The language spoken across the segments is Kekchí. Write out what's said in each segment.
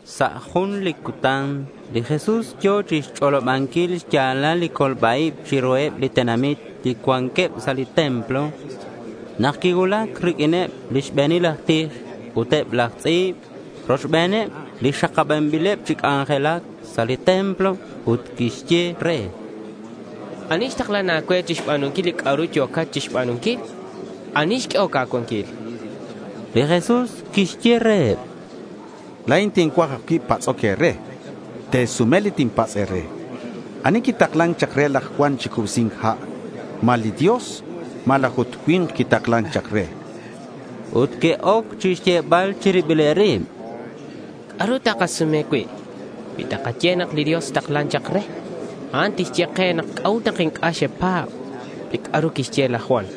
Sa' jun li cutan li Jesús yo̱ chixch'olobanquil xya̱lal li colba-ib chiruheb li tenamit li cuanqueb sa' li templo, nak que'cuulac riq'uineb li xbe̱nil laj tij ut eb laj tz'i̱b rochbeneb li xakabanbileb chi c'anjelac sa' li templo. Ut que'xye re: —¿Ani xtaklan a̱cue chixba̱nunquil li c'a'ru yo̱cat chixba̱nunquil? ¿Ani xq'uehoc a̱cuanquil? chanqueb. Li Jesús quixye reheb: —La̱in tincuaj ajcui' patz'oc e̱re. Te̱sume li tinpatz' e̱re. ¿Ani quitaklan chak re laj Juan chi cubsi̱nc ha'? ¿Ma li Dios malaj ut cui̱nk quitaklan chak re? chan li Jesús reheb. Ut que'oc chixyebal chi ribileb rib: —¿C'a'ru takasume cui'? Cui takaye nak li Dios xtaklan chak re, a'an tixye ke c'a'ut nak inc'a' xkapa̱b li c'a'ru quixye laj Juan.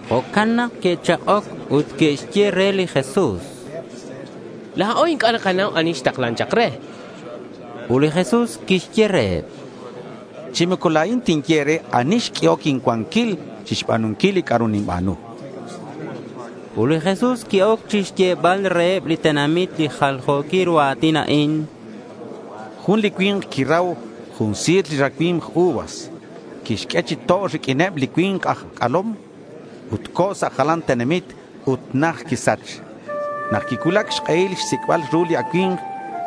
Jo'can nak que'chak'oc ut que'xye re li Jesús: —La̱o inc'a' nakanau ani xtaklan chak re, chanqueb. Ut li Jesús quixye reheb: —Chi moco la̱in tinye e̱re ani xq'uehoc incuanquil chixba̱nunquil li c'a'ru ninba̱nu, chan reheb. Ut li Jesús qui-oc chixyebal reheb li tenamit li jaljo̱quil ru a̱tin a'in: Jun li cui̱nk quirau jun si̱r li racui̱mk uvas. Quixq'ue chi to' riq'uineb li cui̱nk aj c'alom. Ut co̱ sa' jalan tenamit ut najt quisach. Nak quicuulac xk'ehil xsic'bal ru li acui̱mk,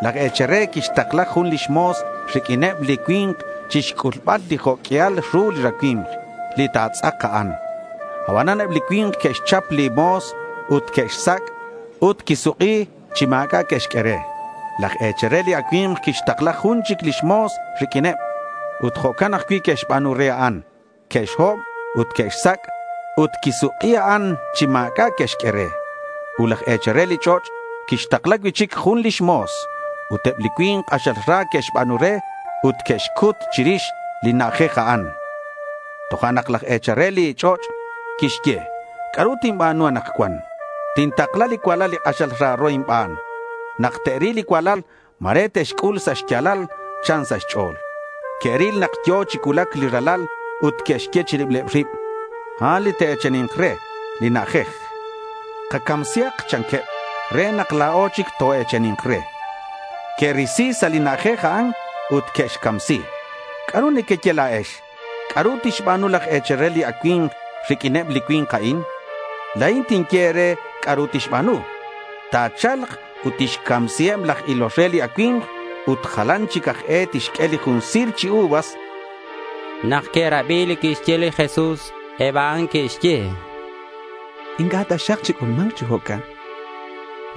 laj e̱chal re quixtakla jun lix mo̱s riq'uineb li cui̱nk chixc'ulbal li jo' q'uial ru li racui̱mk li ta̱tz'ak a'an. Abanan eb li cui̱nk que'xchap li mo̱s ut que'xsac'. Ut quisuk'i chi ma̱c'a' que'xq'ue re. Laj e̱chal re li acui̱mk quixtakla jun chic lix mo̱s riq'uineb. Ut jo'can ajcui' que'xba̱nu re a'an. Que'xhob ut que'xsac' ut quisuk'i a'an chi ma̱c'a' que'xq'ue re. Ut laj e̱chal re li ch'och' quixtakla cui'chic jun lix mo̱s. Ut eb li cui̱nk k'axal ra que'xba̱nu re ut que'xcut chirix li na'ajej a'an. Tojo'nak laj e̱chal re li ch'och' quixye: —¿C'a'ru tinba̱nu anakcuan? Tintakla li cualal li k'axal raro inban. Nak te'ril li cualal, ma̱re te'xc'ul sa' xya̱lal, chan sa' xch'o̱l. Que'ril nak yo̱ chi cuulac li ralal, ut que'xye chi ribileb rib: —A'an li ta̱e̱chani̱nk re li na'ajej. Kacamsihak, chanqueb, re nak la̱o chic toe̱chani̱nk re. Que'risi sa' li na'ajej a'an ut que'xcamsi. ¿C'a'ru nequeye la̱ex? ¿C'a'ru tixba̱nu laj e̱chal re li acui̱mk riq'uineb li cui̱nk a'in? La̱in tinye e̱re c'a'ru tixba̱nu. Ta̱cha̱lk ut tixcamsiheb laj ilol re li racui̱mk ut jalan chic aj e tixq'ue li jun si̱r chi uvas, chan li Jesús. Nak que'rabi li quixye li Jesús, eb a'an que'xye: —Inc'a' taxak chic'ulma̱nk chi jo'can, chanqueb.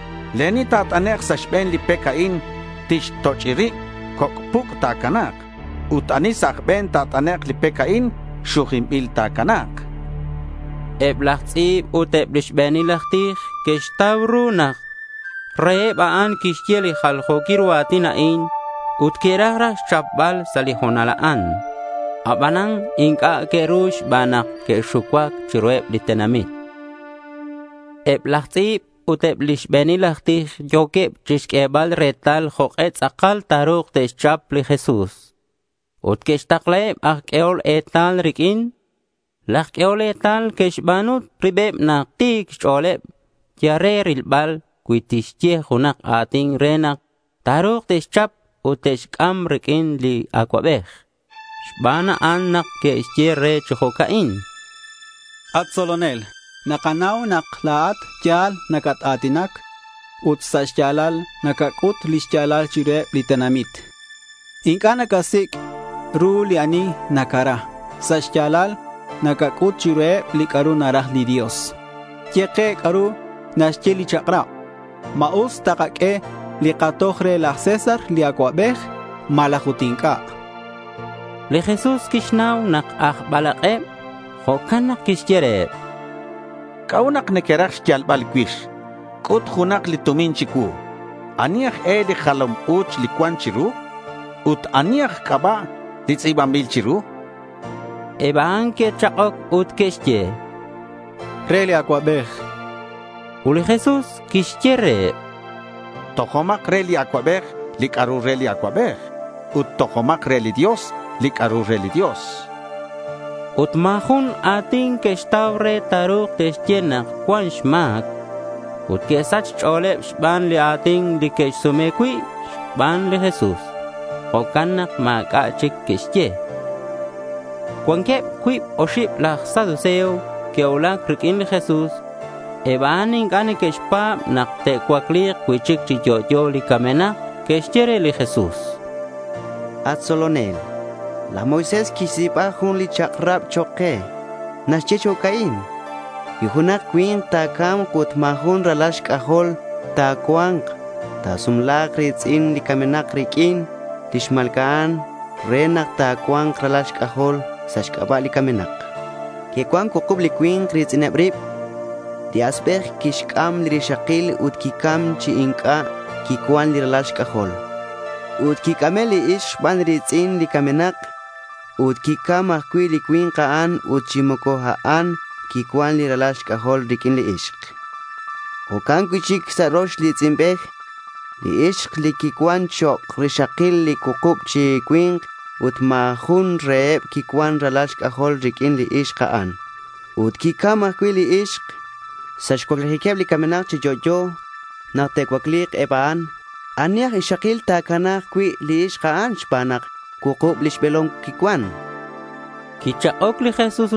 Li ani ta̱t'anek' sa' xbe̱n li pec a'in, tixtoch'i rib. Coc' puc' ta̱cana̱k. Ut ani sa' aj be̱n ta̱t'anek' li pec a'in, xujinbil ta̱cana̱k. Eb laj tz'i̱b ut eb li xbe̱nil aj tij que'xtau ru nak reheb a'an quixye li jaljo̱quil ru a̱tin a'in ut que'raj raj xchapbal sa' li ho̱nal a'an. Abanan inc'a' que'ru xban nak que'xucuac chiruheb li tenamit. Eb laj tz'i̱b ut eb li xbe̱nil aj tij yo̱queb chixq'uebal retal jok'e tz'akal ta̱ru̱k te'xchap li Jesús. Ut que'xtaklaheb aj q'uehol etal riq'uin. Laj q'uehol etal que'xba̱nu ribeb nak ti̱queb xch'o̱l yal re rilbal cui tixye junak a̱tin re nak ta̱ru̱k te'xchap ut te'xc'am riq'uin li acuabej. Xban a'an nak que'xye re chi jo'ca'in: —At tzolonel, nakanau nak la̱at ya̱l nacat-a̱tinac ut sa' xya̱lal nacac'ut li xya̱lal chiruheb li tenamit. Inc'a' nacasic' ru ani nacara. Sa' xya̱lal nacac'ut chiruheb li c'a'ru naraj li Dios. Ye ke c'a'ru naxye li chak'rab. ¿Ma us takaq'ue li katoj re laj César li acuabej malaj ut inc'a'? chanqueb re. Li Jesús quixnau nak aj balak'eb. Jo'can nak quixye reheb: —¿C'a'ut nak nequeraj xyalbal cuix? C'ut junak li tumin chicuu. ¿Ani aj e li jalam u̱ch li cuan chiru? Ut, ¿ani aj c'aba' li tz'i̱banbil chiru? chan. Eb a'an que'chak'oc ut que'xye: —Re li acuabej. Ut li Jesús quixye reheb: —Tojomak re li acuabej li c'a'ru re li acuabej, ut tojomak re li Dios li c'a'ru re li Dios, chan. Ut ma̱ jun a̱tin que'xtau re ta̱ru̱k te'xye nak cuan xma̱c. Ut que'sach xch'o̱leb xban li a̱tin li que'sume̱c cui' xban li Jesús. Jo'can nak ma̱c'a' chic que'xye. Cuanqueb cuib oxib laj saduceo que'cuulac riq'uin li Jesús. Eb a'an inc'a' neque'xpa̱b nak te'cuacli̱k cui'chic chi yo'yo li camenak. Que'xye re li Jesús: —At tzolonel, laj Moisés quixtz'i̱ba jun li chak'rab chok' ke. Naxye chi jo'ca'in: Cui junak cui̱nk ta̱ca̱mk ut ma̱ jun li ralal xc'ajol ta̱cua̱nk, ta̱sumla̱k li ri̱tz'in li camenak riq'uin li xma̱lca'an re nak ta̱cua̱nk ralal xc'ajol sa' xc'aba' li camenak. Que'cuan cuukub li cui̱nk ri̱tz'ineb rib. Li asbej quixc'am rixakil ut quicam chi inc'a' quicuan ralal xc'ajol. Ut quic'ame' li ixk xban li ri̱tz'in li camenak ut quicam ajcui' li cui̱nk a'an ut chi moco a'an quicuan ralal xc'ajol riq'uin li ixk. Ut jo'can cui'chic li rox i̱tz'inbej. Li ixk quicuan chok' rixakil li cuukub chi cui̱nk ut ma̱ jun reheb quicuan ralal xc'ajol riq'uin li ixk a'an. Ut quicam ajcui' li ixk. Sa' xcuaclijiqueb li camenak chi yo'yo, nak te'cuacli̱k eb a'an, ¿ani aj ixakil ta̱cana̱k cui' li ixk a'an xban nak cuukub lix be̱lom quicuan? chanqueb re li Jesús.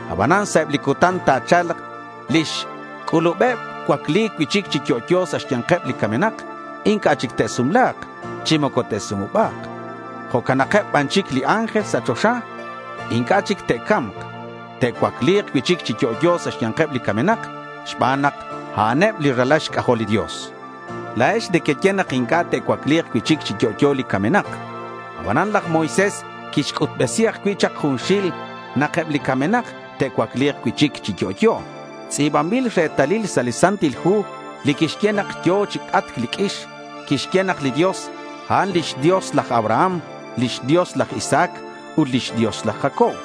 Abanan sa' eb li cutan ta̱cha̱lk, li xc'ulubeb cuacli̱c cui'chic chi yo'yo sa' xya̱nkeb li camenak, inc'a' chic te'sumla̱k chi moco te'sumuba̱k. Jo'cakeb ban chic li ángel sa' choxa. Inc'a' chic te'ca̱mk. Te'cuacli̱k cui'chic chi yo'yo sa' xya̱nkeb li camenak, xban nak a'an eb li ralal xc'ajol li Dios. La̱ex nequeye nak inc'a' te'cuacli̱k cui'chic chi yo'yo li camenak. Abanan laj Moisés quixc'utbesi ajcui' chak junxil nak eb li camenak te'cuacli̱k cui'chic chi yo'yo. Tz'i̱banbil retalil sa' li Santil Hu li quixye nak yo̱ chi c'atc li q'uix. Quixye nak li Dios, a'an lix Dios laj Abraham, lix Dios laj Isaac, ut lix Dios laj Jacob.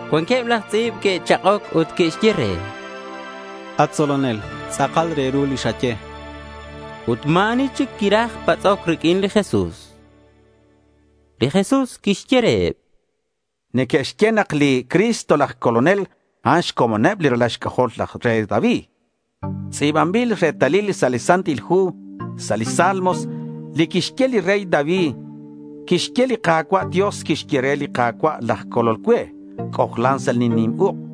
Cuanqueb laj tz'i̱b que'chak'oc ut que'xye re: —At tzolonel, tz'akal re ru li xaye, chanqueb. Ut ma̱ ani chic quiraj patz'oc riq'uin li Jesús. Li Jesús quixye reheb: —Neque'xye nak li Cristo laj Colonel a'an xcomoneb li ralal xc'ajol li rey David. Tz'i̱banbil retalil sa' li Santil Hu sa' li Salmos li quixye li rey David. Quixye: Li Ka̱cua' Dios quixye re li Ka̱cua' laj Colol cue, c'ojlan sa' li nim uk'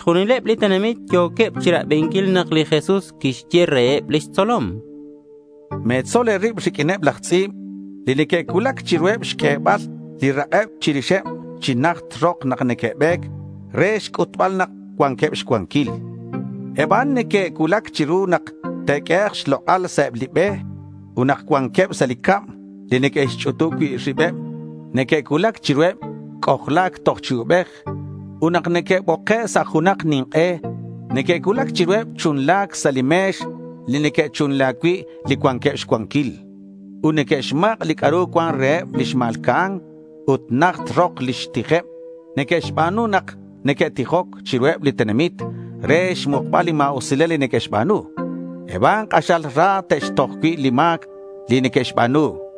Chixjunileb li tenamit yo̱queb chirabinquil nak li Jesús quixye reheb lix tzolom: —Me̱tzol e̱rib riq'uineb laj tz'i̱b li neque'cuulac chiruheb xq'uebal li rak'eb chirixeb chi najt rok nak neque'be̱c re xc'utbal nak cuanqueb xcuanquil. Eb a'an neque'cuulac chiru nak te'q'uehek' xlok'al sa' eb li be. Ut nak cuanqueb sa' li cab li neque'xch'utub cui' ribeb, neque'cuulac chiruheb c'ojla̱c toj chi ubej. Ut nak neque'boke' sa' junak nink'e, neque'cuulac chiruheb chunla̱c sa' li me̱x li neque'chunla cui' li cuanqueb xcuanquil. Ut neque'xmak' li c'a'ru cuan reheb li xma̱lca'an. Ut najt rok lix tijeb neque'xba̱nu nak neque'tijoc chiruheb li tenamit re xmukbal li ma̱usilal li neque'xba̱nu. Eb a'an k'axal ra te'xtoj cui' li ma̱c neque'xba̱nu, chan li Jesús.